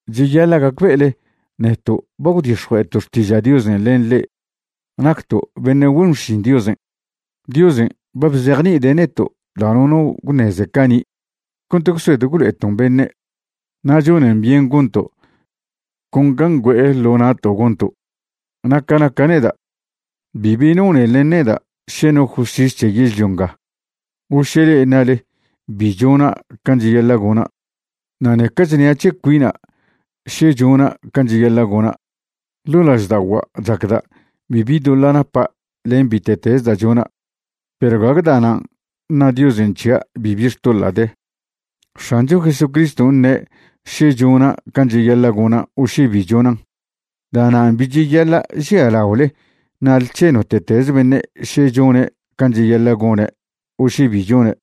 Cheyaḻa' gacbe'ele neto' ba gwdix̱jue'eto' xtiža' Diosen' len le'e nacto' beṉe' güen xšin Diosen'. Diosen' ba bzejni'ide' neto' da' nono gwṉeze cani' cont gwsed gwlo'eton' beṉe'. Na' chonen byen gonto' con can' ngüe'e ḻo na'to' gonto'. Na' ca naca' neda', bibi nonen len neda' še no justis c̱he yežlio nga o še le'e ṉale bi chona' can' cheyaḻa' gona'. Na' ṉeca chnia' c̱he cuina' še chona' can' cheyaḻa' gona'. Ḻo' lažda'ogua' chacda' bibi doḻa' napa' len bite'tez da' chona', perw gague da'nan' ṉa Diosen' c̱hia' bibi xtoḻa' de. X̱ancho Jesucriston' ṉe' še chona' can' cheyaḻa' gona' o še bi chonan'. Da'nan' bi cheyaḻa' žialaole ṉale c̱he note'teze beṉe' še chone' can' cheyaḻa' gone' o še bi chone'.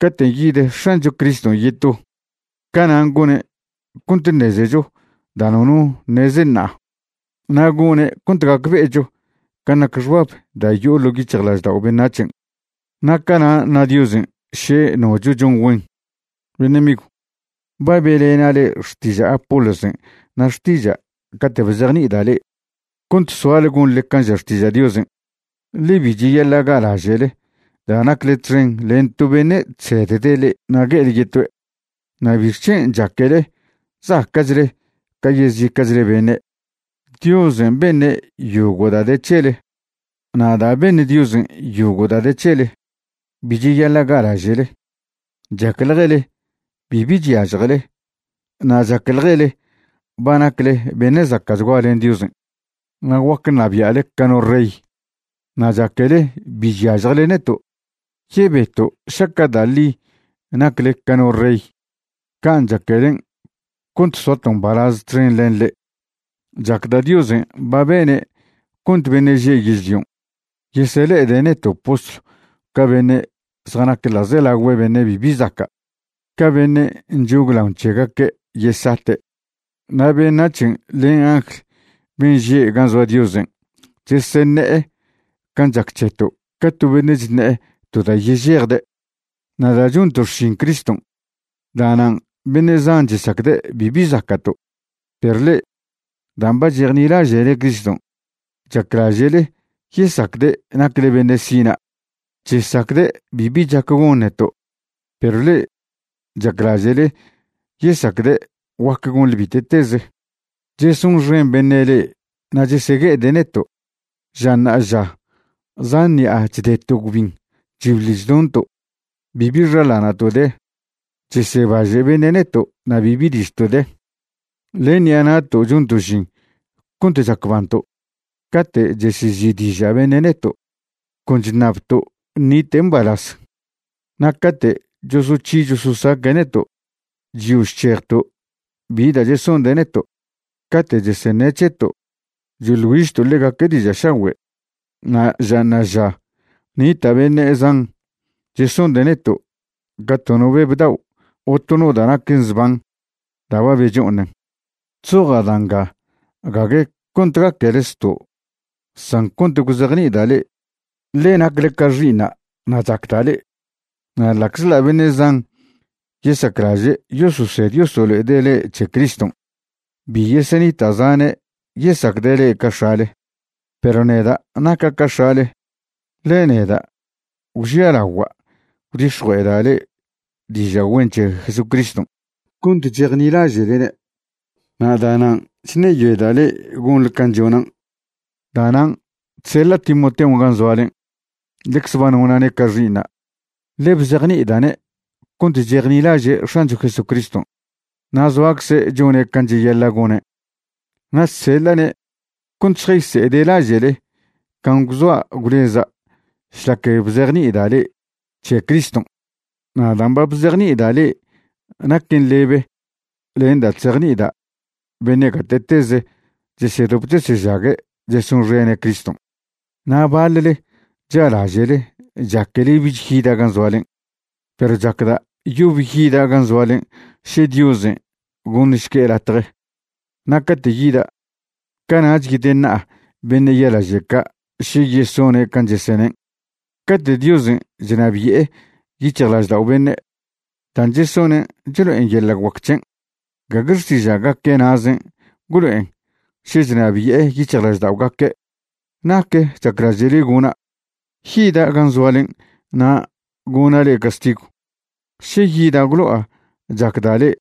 Caten' yid X̱ancho Criston' yeto, canan' gone' cont ṉezecho da' nono ṉeze ṉa'a, na' gone' cont gacbe'echo can' nac xbab da' yo'o ḻo' yic̱hjlaždao' beṉac̱hen'. Na' cana' ṉa Diosen' še nocho chon güen. Beṉe' migw, ba be'lena' le'e xtiža' Apolosen' na' xtiža' cate' bzejni'ida' le'e, cont soale gonḻe can' ža Xtiža' Diosen', ḻe bi cheyaḻa' ga'laže'le da' nacle txen len to beṉe' chsedde' le'e na' gue'ele yetoe'. Na' ¿bixc̱hen' chaquele zaca'chle ca yezica'chle beṉe'? Diosen' beṉe' yogo' da' de c̱hele, na' da' beṉ Diosen' yogo' da' de c̱hele, bi cheyaḻa' ga'laže'le. Chacḻjele bibi chyažjele na' chacḻjele ba nacle beṉe' zaca'chgua len Diosen' na' guac ṉabia'le ca no rey, na' chaquele bi chyažjele neto'. Yebeto' šaca' da' ḻi nacle ca no rey can' chaquelen' cont soato' mbalaz txen len le'e. Chacda' Diosen' ba bene' cont beṉe' že' yežlion' yesele'ede' neto' postlw ca beṉe' zjanac ḻa'zelagüe beṉe' bibi zaca', ca beṉe' nchoglaon c̱hegaque' yesate'. Na' beṉac̱hen' len angl ben' že' gan' zoa Diosen' cheseṉe'e can' chac c̱heto' ca to beṉe' chṉe'e to da' yežejde'. Na' da' chonto' xšin Criston' da'nan' beṉe' zan chesacde' bibi zaca'to', perw le'e, dan' ba chejnilaže'le Criston' chaclaže'le yesacde' nacle beṉe' sina'. Chesacde' bibi chac gon neto', perw le'e chaclaže'le yesacde' guac gonḻe bite'teze. Chesonxen beṉe' le'e na' chesegue'ede' neto'. Ža ṉa'aža zan ṉi'a chdeto' gwbin chbiḻ chdonto', bibi xaḻana'to' de, chesebaže' beṉe' neto' na' bibi ližto' de. Len ṉi'a na'to' chonto' žin cont chacbanto'. Cate' chesezi'diža' beṉe' neto', con chṉabto' ṉite' mbalaz, na' cate' chosoc̱hi chososaque' neto', chyo chc̱hejto' bi da' chesonde' neto'. Cate' cheseṉe' c̱heto', choḻ güižto' ḻegaque' diža' šagüe'. Na' ža ṉa'aža nita' beṉe' zan chesonde' neto' ca to no beb dao' o to no da' naquen zban da' ba becho'oṉen. Chzoja' da' nga gague cont gaquele zto' san cont gwzejni'ida' le'e, ḻe nacle ca xi'iṉa' na' chacda' le'e. Na' ḻa'czḻa' beṉe' zan yesaclaže' yososed yosolo'ede' le'e c̱he Criston', bi yesenita' zane' yesacde' le'e ca x̱ale. Perw neda' naca' ca x̱ale, ḻe neda' gwžialagua' gwdix̱jue'eda' le'e diža' güen c̱he Jesucriston' cont chejnilaže'lene'. Na' da'nan' chṉeyoeda' le'e gonḻe can' chonan'. Da'nan' chseḻa' Timoteon' gan' zoalen'. Ḻecze ba nona'ne' ca xi'iṉa', ḻe bzejni'ida'ne' cont chejnilaže' X̱ancho Jesucriston', na' zoacze' chone' can' cheyaḻa' gone'. Na' chseḻa'ne' cont šjayse'ede' laže'le can' gwzoa gwleza' šlac bzejni'ida' le'e c̱he Criston', na' da' bzejni'ida' le'e naquen lebe len da' chzejni'ida' beṉe' gate'teze chesedop chesežague' chesonxene' Criston'. Na' baḻle cha'laže'le chaquele bich yida' gan' zoalen'. Perw chacda' yob yida' gan' zoalen' še Diosen' goṉšque' latje. Na' cate' yida', cana'ch yedeṉa'a beṉe' ya'laže' ca' še yesone' can' chesenen'. Cate' Diosen' chnabi'e yic̱hjlaždao' beṉe', dan' chesonen' chlo'en yeḻa' guac c̱hen', gague xtiža'gaque' na'zen' gwlo'en še chnabi'e yic̱hjlažda'ogaque'. ¿Nac chaclaže'le gona'? ¿Yida' gan' zoalen' na' gona' le'e castigw, še yida' gwlo'a chacda' le'e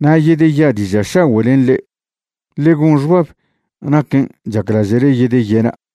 na' yedeya' diža' šagüe' len le'e? Ḻe gon xbab naquen' chaclaže'le yedeyena'.